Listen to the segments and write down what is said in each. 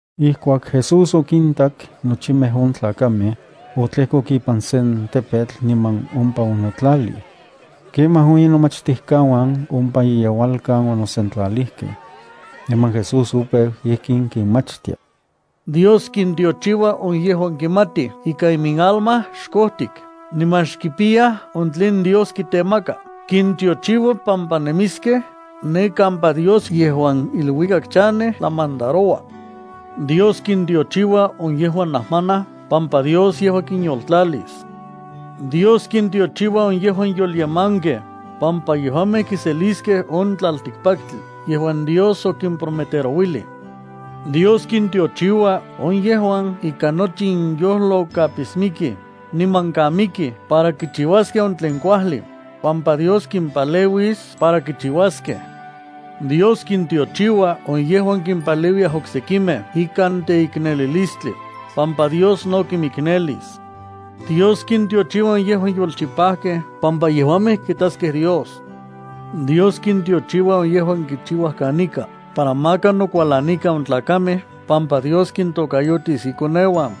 Ijkuak Jesús okintak nochimej on tlakamej, otlejkok ipan sen tepetl niman ompa onotlalij. Kemaj on inomachtijkauan ompa iyeualkan onosentlalijkej. Niman Jesús opeu ijkin kinmachtia: —Dios kintiochiua on yejuan kimatij ika iminalma xkojtik niman xkipiyaj on tlen Dios kitemaka. Kintiochiua pampa nemiskej ne kampa Dios yejuan iluikak chanej tlamandaroua. ’Dios kintiochiua on yejuan najmanaj pampa Dios yejua kinyoltlalis. ’Dios kintiochiua on yejuan yolyemankej pampa yejuamej kiseliskej on tlaltikpaktli yejuan Dios okimprometerouilij. ’Dios kintiochiua on yejuan ikan nochi inyojlo kapismikij niman kamikij para kichiuaskej on tlen kuajli pampa Dios kimpaleuis para kichiuaskej. ’Dios kintiochiua on yejuan kimpaleuiyaj oksekimej ikan teiknelilistli pampa Dios no kimiknelis. ’Dios kintiochiua on yejuan yolchipajkej pampa yejuamej kitaskej Dios. ’Dios kintiochiua on yejuan kichiuaj kanika para maka nokualanikan on tlakamej pampa Dios kintokayotis ikoneuan.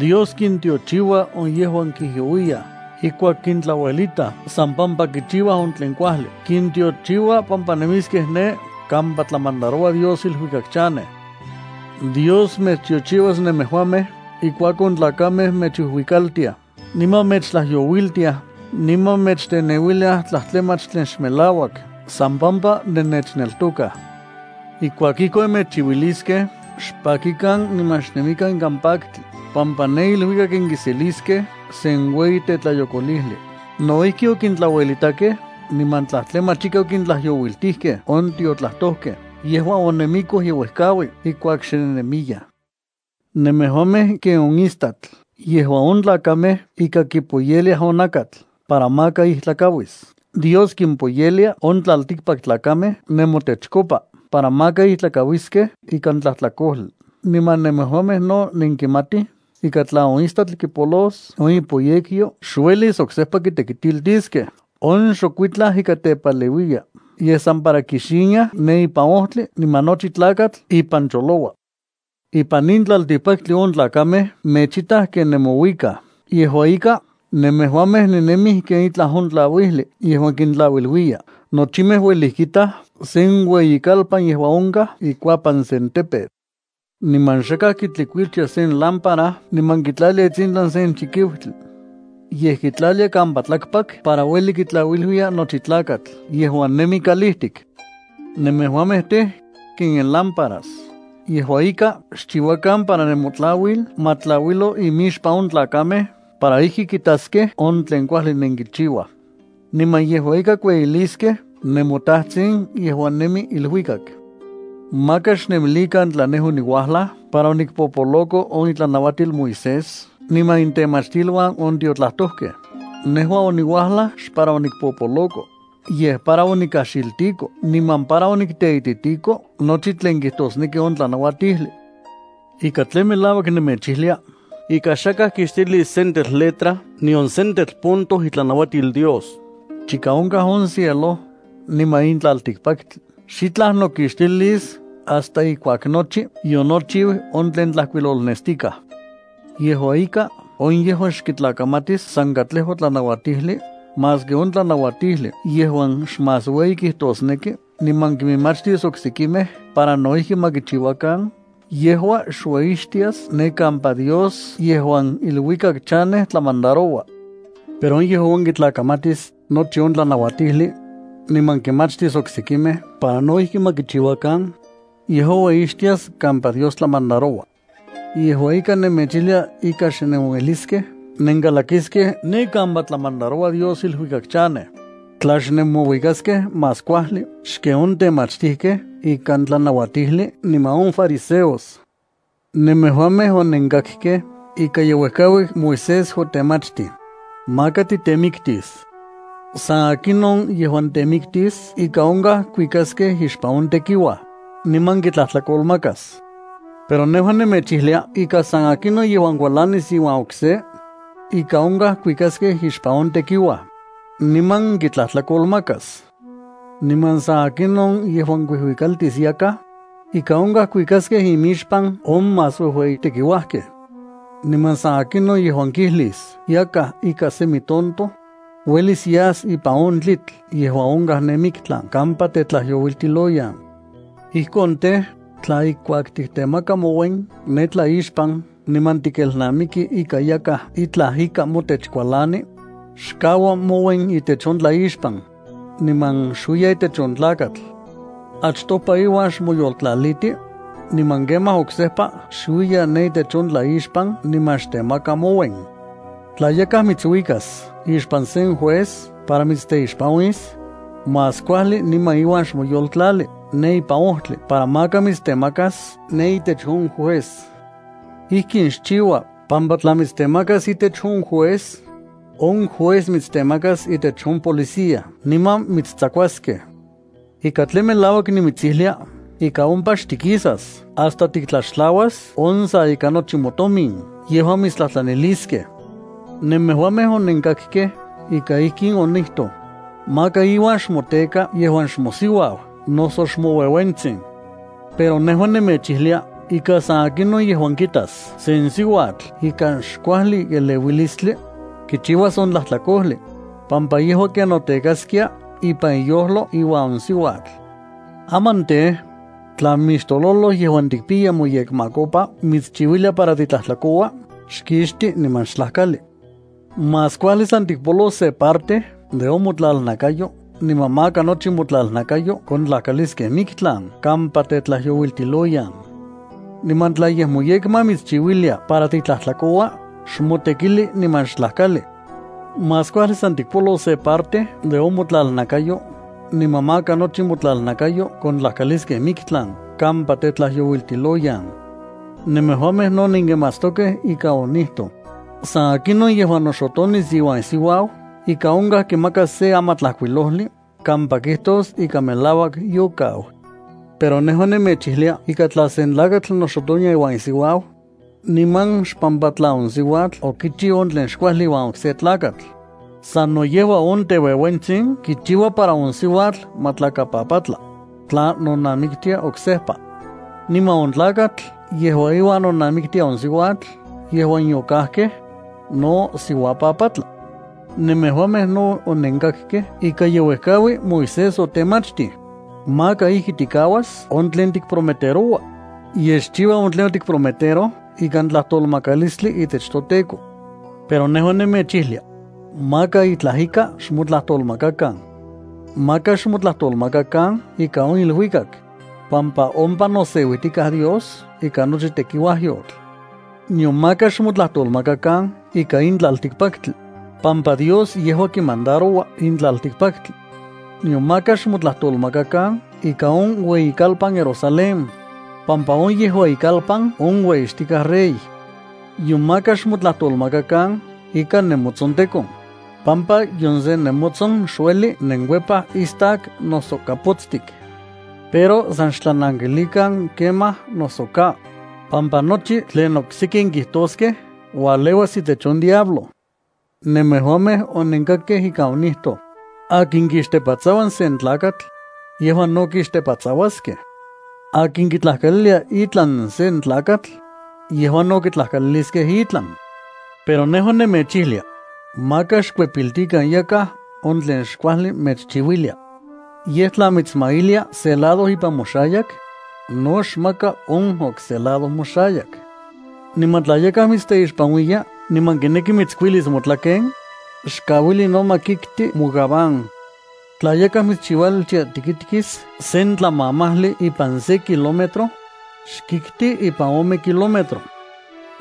’Dios kintiochiua on yejuan kijyouiyaj ijkuak kintlauelitaj san pampa kichiuaj on tlen kuajli. Kintiochiua pampa nemiskej ne kampa tlamandaroua Dios iluikak chanej. ’Dios mechtiochiuas nemejuamej ijkuak on tlakamej mechuijuikaltiaj, niman mechtlayouiltiaj, niman mechteneuiliaj tlajtlamach tlen xmelauak san pampa nennechneltokaj. Ijkuak ijkon mechchiuiliskej, xpakikan niman xnemikan ikan paktli, pampa ne iluikak nenkiseliskej sen ueyi tetlayokolijli. No ijki, okintlauelitakej niman tlajtlamach ika okintlajyouiltijkej on tiotlajtojkej yejuan onemikoj yeuejkaui ijkuak xe nennemiyaj. ’Nemejuamej ken on istatl yejuan on tlakamej ika kipoyeliaj on nakatl para maka ijtlakauis. Dios kimpoyelia on tlaltikpaktlakamej nemotechkopa para maka ijtlakauiskej ikan tlajtlakojli. Niman nemejuamej no nenkimatij ika tla on istatl kipolos on ipoyekyo, xuelis oksejpa kitekitiltiskej. On xok itlaj ika tepaleuiya, yej sa para kixiniaj ne ipan ojtli niman nochi tlakatl ipan choloua. ’Ipan in tlaltikpaktli on tlakamej mechitaj ken nemouikaj. Yejua ika, nemejuamej nennemij ken itlaj on tlauijli yejuan kintlauiluiya. Nochimej uelij kitaj sen ueyikalpan yejuan onkaj ikuapan sen tepetl. Niman xakaj kitlikuiltia sen lámpara niman kitlalia itsintlan sen chikiutli, yej kitlalia kampa tlakpak para ueli kitlauiluiya nochi tlakatl yejuan nemi kalijtik. Nemejuamej tej, ken nenlámparas. Yejua ika, xchiuakan para nemotlauil ma tlauilo imixpan on tlakamej para ijki kitaskej on tlen kuajli nenkichiuaj, niman yejua ika kueyiliskej nemoTajtsin yejuan nemi iluikak. ’Maka xnemilikan tla nejua oniuajlaj para onikpopoloko on itlanauatil Moisés niman intemachtiluan on tiotlajtojkej. Nejua oniuajlaj xpara onikpopoloko, yej para onikajxiltiko niman para onikteititiko nochi tlen kijtosneki on tlanauatijli. Ika tlen melauak nemechijlia ika xakaj kixtilis sentetl letra nion sentetl punto itlanauatil Dios chika onkaj on cielo niman in tlaltikpaktli. Xitlaj nokixtilis hasta ijkuak nochi yonochiu on tlen tlajkuilolnestikaj. Yejua ika, on yejuan xkitlakamatis san katlejua tlanauatijli, maski on tlanauatijli yejuan xmás ueyi kijtosneki, niman kinmachtis oksekimej para no ijki ma kichiuakan, yejua xueyixtias kampa Dios yejuan iluikak chanej tlamandaroua. Pero on yejuan kitlakamatis nochi on tlanauatijli, niman kinmachtis oksekimej para no ijki ma kichiuakan, yejua ueyixtias kampa Dios tlamandaroua. Yejua ika, nemechijlia ika xnenueliskej nenkalakiskej ne kampa tlamandaroua Dios iluikak chanej, tla xnenmouikaskej más kuajli xken on temachtijkej ikan tlanauatijli niman on fariseos. ’Nemejuamej onenkakkej ika ye uejkaui Moisés otemachtij: “Maka titemiktis. San akinon yejuan temiktis ika onkaj kuikaskej ixpan on tekiuaj, niman kitlajtlakolmakas.” Pero nejua nemechijlia ika san akinon yejuan kualanis iuan okse, ika onkaj kuikaskej ixpan on tekiuaj, niman kitlajtlakolmakas. Niman san akinon yejuan kuijuikaltis yakaj, ika onkaj kuikaskej imixpan on más uejueyi tekiuajkej. Niman san akinon yejuan kijlis yakaj ika semi tonto, uelis yas ipan on tlitl yejuan onkaj ne miktlan kampa tetlajyouiltiloyan. ’Ijkon tej, tla ijkuak tiktemaka mouen ne tlaixpan niman tikelnamiki ika yakaj itlaj ika motech kualani, xkaua mouen itech on tlaixpan, niman xuiya itech on tlakatl. Achtopa iuan xmoyoltlaliti, niman kemaj oksejpa xuiya ne itech on tlaixpan niman xtemaka mouen. ’Tla yakaj mitsuikas ixpan sen juez para mitsteixpanuis, más kuajli niman iuan xmoyoltlali ne ipan ojtli para maka mitstemakas ne itech on juez. Ijkin xchiua pampa tla mitstemakas itech on juez, on juez mitstemakas itech on policía niman mitstsakuaskej. Ika tlen melauak nimitsijlia ika ompa xtikisas hasta tiktlaxtlauas on sa ika nochi motomin yejuan mitstlajtlaniliskej. ’Nemejuamej onenkakkej ika ijkin onijtoj: “Maka iuan xmoteka yejuan xmosiuau noso xmoueuentsin.” Pero nejua nemechijlia ika san akinon yejuan kitas se siuatl ikan xkuajli eleuilistli, kichiuas on tlajtlakojli, pampa yejua ken notekaskia ipan iyojlo iuan on siuatl. ’Aman tej, tla mixtololoj yejuan tikpiya moyekmakopa mitschiuilia para titlajtlakoua, xkixti niman xtlajkali. Más kuajli san tikpolos se parte de on motlalnakayo niman maka nochi motlalnakayo kontlajkaliskej miktlan kampa tetlajyouiltiloyan. Niman tla yej moyekma mitschiuilia para titlajtlakoua, xmotekili niman xtlajkali. Más kuajli san tikpolos se parte de on motlalnakayo niman maka nochi motlalnakayo kontlajkaliskej miktlan kampa tetlajyouiltiloyan. ’Nemejuamej no nenkimatstokej ika onijtoj: “San akinon yejuan noxotonis iuan isiuau ika onkaj kimakas se amatlajkuilojli kampa kijtos ika melauak yokau.” Pero nejua nemechijlia ika tla sen tlakatl noxotonia iuan isiuau, niman xpampa tla on siuatl okichiu on tlen xkuajli iuan okse tlakatl, sano yejua on teueuentsin kichiua para on siuatl ma tlakapapatla, tla nonamiktia oksejpa. Niman on tlakatl yejuan iuan nonamiktia on siuatl yejuan yokajkej, no siuapapatla. ’Nemejuamej no onenkakkej ika ye uejkaui Moisés otemachtij: “Maka ijki tikauas on tlen tikprometeroua, yej xchiua on tlen otikprometeroj ikantlajtolmakalistli itech toTEKO.” Pero nejua nemechijlia: Maka itlaj ika xmotlajtolmakakan. Maka xmotlajtolmakakan ika on iluikak, pampa ompa noseuijtikaj Dios ikan nochi tekiuajyotl. Nion maka xmotlajtolmakakan ikan in tlaltikpaktli, pampa Dios yejua kimandaroua in tlaltikpaktli. Nion maka xmotlajtolmakakan ikan on ueyikalpan Jerusalén, pampa on yejua ikalpan on ueyixtikaj Rey. Nion maka xmotlajtolmakakan ikan nemotsontekon, pampa nion se nemotson xueli nenkuepaj istak noso kapotstik. Pero san xtlanankilikan “kemaj” noso “ka”, pampa nochi tlen okseki nenkijtoskej ualeuas itech on diablo. ’Nemejuamej onenkakkej ika onijtoj: “Akin kixtepatsaua sen tlakatl, yejua no kixtepatsauaskej. Akin kitlajkalilia itlan sen tlakatl, yejua no kitlajkaliliskej itlan.” Pero nejua nemechijlia: Maka xkuepiltikan yakaj on tlin xkuajli mechchiuilia. Yej tla mitsmailia se lado ipan moxayak, no xmaka on okse lado moxayak. Niman tla yakaj mitsteixpanuiya niman kineki mitskuilis motlaken, xkauili no ma kikti mogabán. Tla yakaj mitschiualtia tikitkis sen tlamamajli ipan se kilómetro, xkikti ipan ome kilómetro.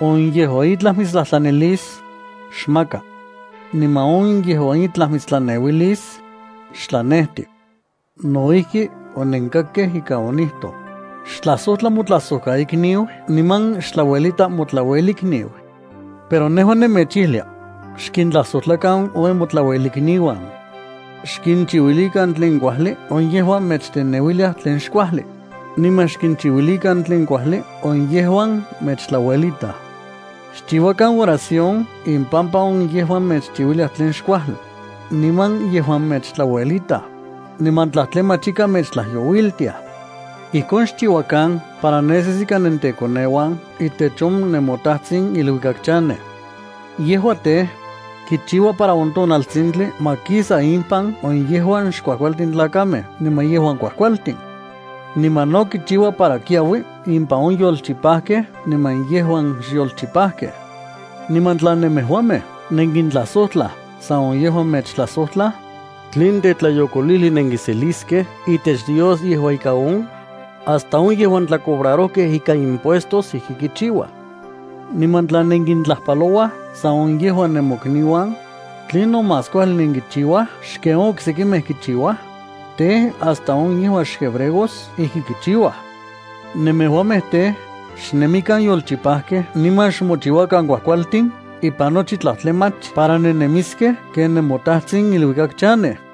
On yejuan itlaj mitstlajtlanilis, xmaka. Niman on yejuan itlaj mitstlaneuilis, xtlanejti. ’No ijki onenkakkej ika onijtoj: “Xtlajsojtla motlajsojkaikniu niman xtlauelita motlauelikniu.” Pero nejua nemechijlia: Xkintlajsojtlakan on nemotlauelikniuan. Xkinchiuilikan tlen kuajli on yejuan mechteneuiliaj tlen xkuajli, niman xkinchiuilikan tlen kuajli on yejuan mechtlauelitaj. Xchiuakan oración impampa on yejuan mechchiuiliaj tlen xkuajli, niman yejuan mechtlauelitaj, miman tlajtlamach ika mechtlajyouiltiaj. Ijkon xchiuakan para nesis ika nentekoneuan itech on nemoTajtsin iluikak chanej. Yejua tej, kichiua para on tonaltsintli ma kisa impan on yejuan xkuajkualtin tlakamej niman yejuan kuajkualtin. Niman no kichiua para kiaui impan on yolchipajkej niman yejuan xyolchipajkej. Niman tla nemejuamej nenkintlajsojtlaj san on yejuan mechtlajsojtlaj, ¿tlen tetlayokolijli nenkiseliskej itech Dios yejua ika on? Hasta on yejuan tlacobrarojkej ikan impuestos ijki kichiuaj. Niman tla nenkintlajpalouaj san on yejuan nemokniuan, ¿tlinon más kuajli nenkichiuaj xken on oksekimej kichiuaj? Tej, hasta on yejuan xhebreos ijki kichiuaj. Nemejuamej tej, xnemikan yolchipakej niman xmochiuakan kuajkualtin ipan nochi tlajtlamach para nennemiskej ken nemoTajtsin iluikak chanej.